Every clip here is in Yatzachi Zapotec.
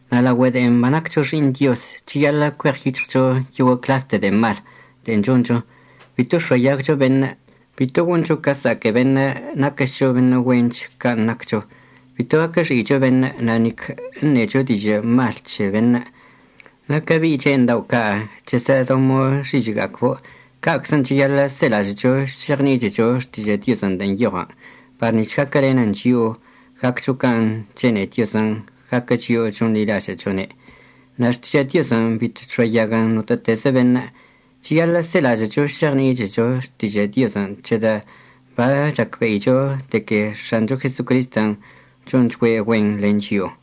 Na' laogüe de'en banaccho xi'iṉ Dioz, cheyaḻə' cueɉyic̱hɉcho yoguə' cḻaste de'e mal de'en choncho. Bito əx̱oayagcho beṉə', bito goncho ca əsa'aque beṉə' naquəchcho beṉə' güench can' naccho, bito gaquəxi'icho beṉə' na' nic əṉecho dižə' mal c̱he beṉə'. Na' ca bi'i che'eṉ dao' ca' chəsə'ədombo' xižə'əga'acbo' ca'aczən' cheyaḻə' selažə'əcho šeɉni'ichecho Xtižə' Diozən' de'en nyoɉən par nic̱h gaquəlenən chio'o gaccho can' chene'e Diozən' gaquə chio'o chonḻilažə'əchone'. Na' Xtižə' Diozən' bito chx̱oayaguən notə'ətezə beṉə'. Cheyaḻə' selažə'əcho šeɉni'ichecho Xtižə' Diozən' c̱hedə' bachacbe'icho de que X̱ancho Jesocristən' chonchgüe' güen len chio'o.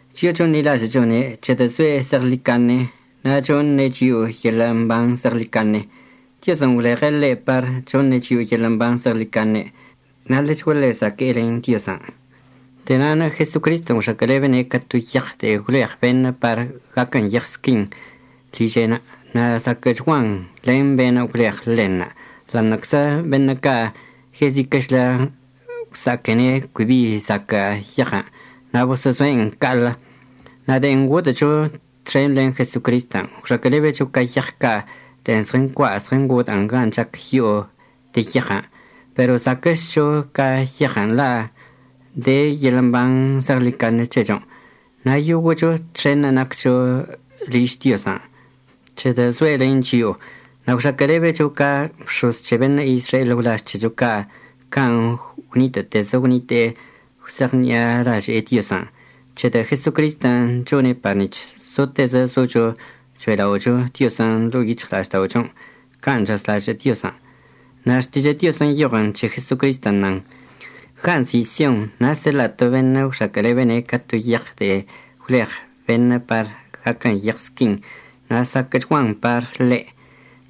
Chio'o chonḻilažə'əchone' c̱hedə' zoe' zeɉḻicaṉe na' choṉe' chio'o yeḻə' mban zeɉḻicaṉe. Diozən' gwleɉe' ḻe' par choṉe' chio'o yeḻə' mban zeɉḻicaṉe na' ḻechguaḻe zaque'e len Diozən'. De'e na'anə' Jesocristən' gwxaquə'əlebene' ca to yeɉ de'en gwleɉ beṉə' par gaquən yeɉ squin liže'enə' na' zaquə'əchguan len be'enə' gwleɉ ḻenṉə', ḻa'aṉə'əczə beṉə' ca' yeziquə'əchlə gwsa'aquene' cui bi zaquə' yeɉən' na' boso'ozo'en ca'aḻə'. Na' de'en ngodə'əcho txen len Jesocristən' gwxaquə'əlebecho ca yeɉ ca' de'en zɉəncua' zɉəngodə'ən gan' chac yo'o de yeɉən'. Pero zaquə'əchcho ca yeɉən' la' de yeḻə' mban zeɉḻicaṉe c̱hechon', na' yoguə'əcho txenṉə' naccho liž Diozən' c̱hedə' zoe' len chio'o. Na' gwxaquə'əlebecho ca bx̱oz c̱he beṉə' Izrael gwlaž c̱hecho ca' can' gwnitə'ətezə gwnite'e gwse'eɉṉi'alaže'e Diozən', c̱hedə' Jesocristən' chone' par nic̱h zotezə zocho cho'ela'ocho Diozən' ḻo'o yic̱hɉla'ažda'ochon' can' chazlažə' Diozən'. Na' Xtižə' Diozən' nyoɉən' c̱he Jesocristən' nan: Gan' nzi' Sion na' əseḻa'a to beṉə' gwxaquə'əlebene' ca to yeɉ de'en gwleɉ beṉə' par gaquən yeɉ squin, na' zaquə'əchguan par ḻe'.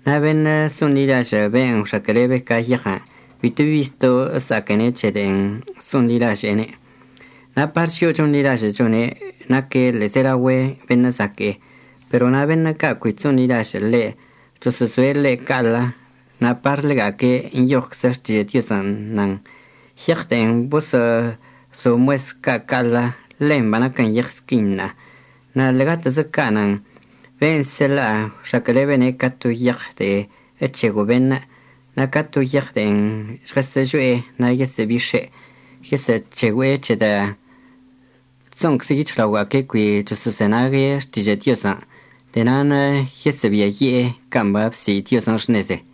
Na' beṉə' so'onḻilažə' ben' gwxaquə'əlebe ca yeɉən' bito bi zto' əsa'aquene' c̱he de'en so'onḻilaže'ene'. Na' par chio'o chonḻilažə'əchone', naque' ḻe'ebeyože beṉə' zaque'e. Pero na' beṉə' ca' cui chso'onḻilažə' ḻe', choso'ozoe' ḻe' ca'aḻə, na' par ḻega'aque' nyoɉczə Xtižə' Diozən', nan: Yeɉ de'en boso'ozo mues ca' ca'aḻə, ḻen banaquən yeɉ squin ṉa'a. Na' ḻe'egatezə ca' nan: Ben' əseḻa'a gwxaquə'əlebene' ca to yeɉ de'e əc̱hego' beṉə', na' ca to yeɉ de'en žɉəsə'əžo'e na' yesə'əbix̱e'. Yesə'əc̱hegüe'e c̱hedə' chso'onczə yic̱hɉlaoga'aque' cui choso'ozenague' Xtižə' Diozən'. De'e na'anə' yesə'əbiayi'e can' babsi' Diozən' xṉeze.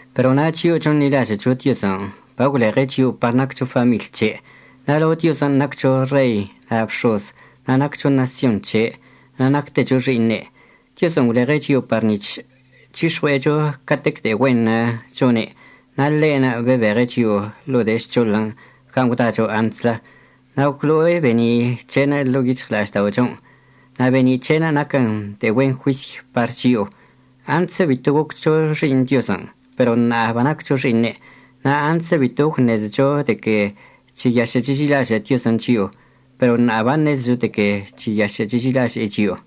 Pero na' chio'o chonḻilažə'əcho Diozən' bagwleɉe' chio'o par naccho famiḻy c̱he'. Na' lao Diozən' naccho rei na' bx̱oz, na' naccho ṉasyon c̱he' na' nactecho xi'iṉe'. Diozən' gwleɉe' chio'o par nic̱h c̱hix̱ɉue'echo catec de'e güenṉə' chone'. Na' ḻe'enə' bebeɉe' chio'o ḻo'o de'e žc̱hoḻən' gan' gwdacho antslə. Na' gwlo'o be'eni' c̱he'enə' ḻo'o yic̱hɉla'ažda'ochon'. Na' be'eni' c̱he'enə' naquən de'e güen juisy par chio'o. Antslə bito goccho xi'iṉ Diozən', pero ṉa'a banaccho xi'iṉe'. Na' antslə bito gwṉezecho de que cheyašə' cheži'ilažə' Diozən' chio'o, pero ṉa'a baṉezecho de que cheyašə' cheži'ilaže'e chio'o.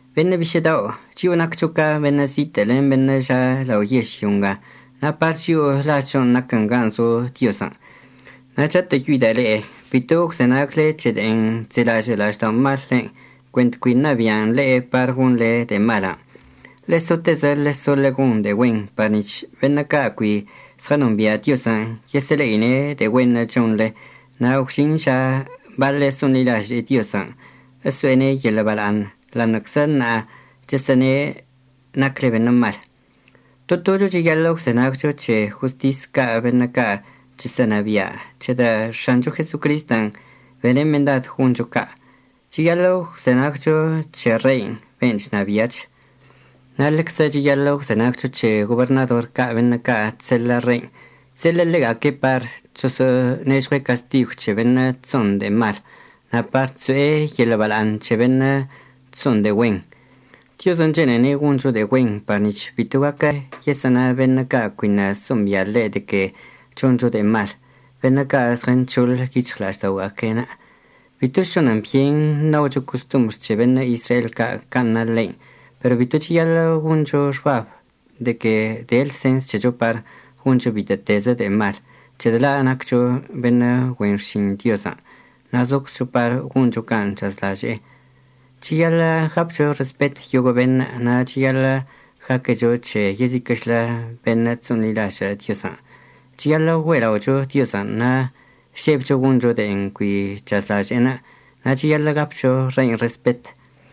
Beṉə' bišə' dao' chio'o naccho ca beṉə' zitə' len beṉə' ža' lao yežlyo nga na' par chio'o lažchon' naquən gan' zo Diozən'. Na' chatə'əyoida' le'e bito əgwzenagle c̱he de'en chzelažə' la'ažda'omallenə' cuent cui ṉabi'an le'e par gonḻe de'e malən'. Ḻe'e sotezə ḻeso ḻegon de'e güen par nic̱h beṉə' ca' cui zɉənombia' Diozən' yesə'əle'ine' de'e güenṉə' chonḻe na' gwžin ža baḻe' so'onḻilaže'e Diozən' əso'ene' yeḻə' bala'aṉ, ḻa'aṉə'əczə ṉa'a chesə'əne' nacle beṉə' mal. To tocho cheyaḻə' əgwzenagcho c̱he jostis ca' beṉə' ca' chesə'ənabia' c̱hedə' X̱ancho Jesocristən' bene' mendad goncho ca'. Cheyaḻə' əgwzenagcho c̱he rein' ben' chnabia'ach. Na' ḻeczə cheyaḻə' əgwzenagcho c̱he goberṉador ca' beṉə' ca' chseḻə' rein'. Chseḻe'e ḻega'aque' par choso'onežɉue' castigw c̱he beṉə' chso'on de'e mal, na' par chso'e yeḻə' bala'aṉ c̱he beṉə' chso'on de'e güen. Diozən' chene'ene' goncho de'e güen par nic̱h bito gaquə yesə'əna beṉə' ca' cuiṉə' so'ombia' ḻe' de que choncho de'e mal, beṉə' ca' ṉezɉənc̱hoḻ yic̱hɉla'ažda'oga'aque'enə'. Bitoch chonən byen ṉaocho costombr c̱he beṉə' Izrael ca' can' na ḻein'. Pero bito cheyaḻə' goncho xbab de que de lsens c̱hecho par goncho bitə'ətezə de'e mal, c̱hedə' la' naccho beṉə' güen xšin Diozən' na' zoczcho par goncho can' chazlaže'enə'. Cheyaḻə' gapcho respet yoguə' beṉə'. Na' cheyaḻə' gaquecho c̱he yeziquə'əchlə beṉə' chso'onḻilažə' Diozən'. Cheyaḻə' güe'ela'ocho Diozən', na' žebcho goncho de'en cui chazlaže'enə', na' cheyaḻə' gapcho rein' respet.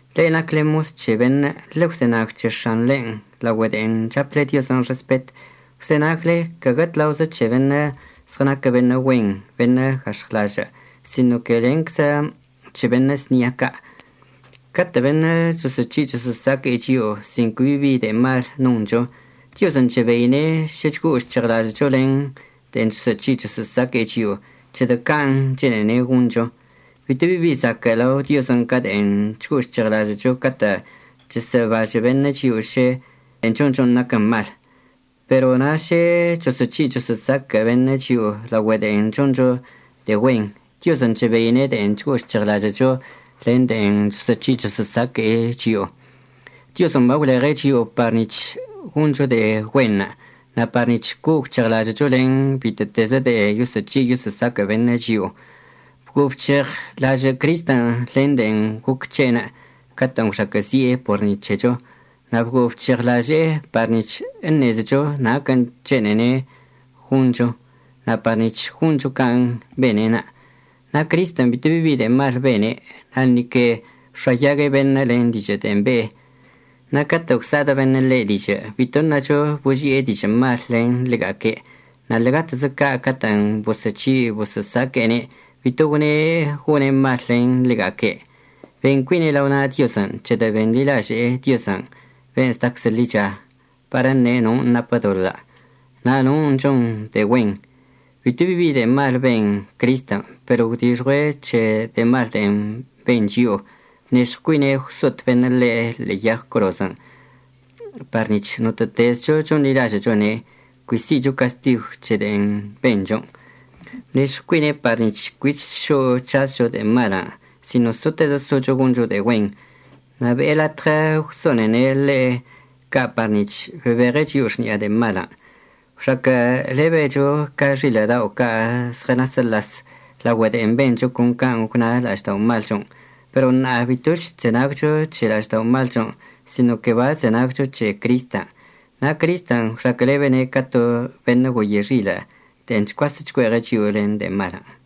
Le'e nacle mos c̱he beṉə', ḻegwzenag c̱he x̱anḻen' laogüe de'en chaple Diozən' respet. Gwzenagle caguə tlaozə c̱he beṉə' zɉənaquə beṉə' güen beṉə' gax̱ɉwlažə', sino que lenczə c̱he beṉə' znia ca'. Catə' beṉə' choso'oc̱hi' choso'osaque'e chio'o sin cui bibi de'e mal noncho, Diozən' chebeine' šə chgo'o chc̱heɉlažə'əcho len de'en choso'oc̱hi' choso'osaque'e chio'o, c̱hedə' can' chene'ene' goncho. Bitobi zaquə' lao Diozən' ca de'en chgo'o chc̱heɉlažə'əcho catə' chesə'əbažə' beṉə' chio'o šə de'en chonchon' naquən mal. Pero na' šə choso'oc̱hi' choso'osaquə' beṉə' chio'o laogüe de'en choncho de'e güen, Diozən' chebeine' de'en chgo'o chc̱heɉlažə'əcho len de'en choso'oc̱hi' choso'osaque'e chio'o. Diozən' bagwleɉe' chio'o par nic̱h goncho de'e güenṉə' na' par nic̱h co'o gwc̱heɉlažə'əcho len bitə'ətezə de'e yoso'oc̱hi' yoso'osaquə' beṉə' chio'o. Bguo'o bc̱heɉlažə' Cristən' len de'en goc c̱he'enə' catə'ən gwxaquə'əzi'e por ni c̱hecho, na' bguo'o bc̱heɉlaže'e par nic̱h əṉezecho naquən' chene'ene' goncho na' par nic̱h goncho can' bene'enə'. Na' Cristən' bitobi de'e mal bene', na' ni que əbx̱oayague' beṉə' len dižə' de'en be'e. Na' catə' gwsa'adə' beṉə' ḻe' dižə' bito ṉacho boži'e dižə' mal len ḻega'aque'. Na' ḻe'egatezə ca' catə'ən boso'ochi' boso'osaque'ene' bito gwne' gone' mal len ḻega'aque'. Ben cuine' lao na' Diozən', c̱hedə' benḻilaže'e Diozən' ben' zdaczə ḻicha par əṉe' non' napə doḻə' na' non' chon de'e güen. Bito bi de'e mal ben Cristən' pero gwdixɉue' c̱he de'e mal de'en ben chio'o. Bnežɉw cuine' gwso'ot beṉə' ḻe' ḻe'e yag corozən', par nic̱h notə'ətezcho chonḻilažə'əchone' cui si'icho castigw c̱he de'en benchon'. Bnežɉw cuine' par nic̱h cuich šo'o c̱hazcho de'e malən' sino sotezə socho goncho de'e güen. Na' be'e latɉə gwso'onene' ḻe' ca' par nic̱h bebeɉe' chio'o xni'a de'e malən'. Gwxaquə'əlebecho ca xilə' ca' zɉənasəlas laogüe de'en bencho con can' gwna la'ažda'omalchon'. Pero ṉa'a bitoch chzenagcho c̱he la'ažda'omalchon', sino que bachzenagcho c̱he Cristən'. Na' Cristən' gwxaquə'əlebene' ca to beṉə' goye xilə' de'en chcuasə' chcue'eɉe' chio'o len de'e malən'.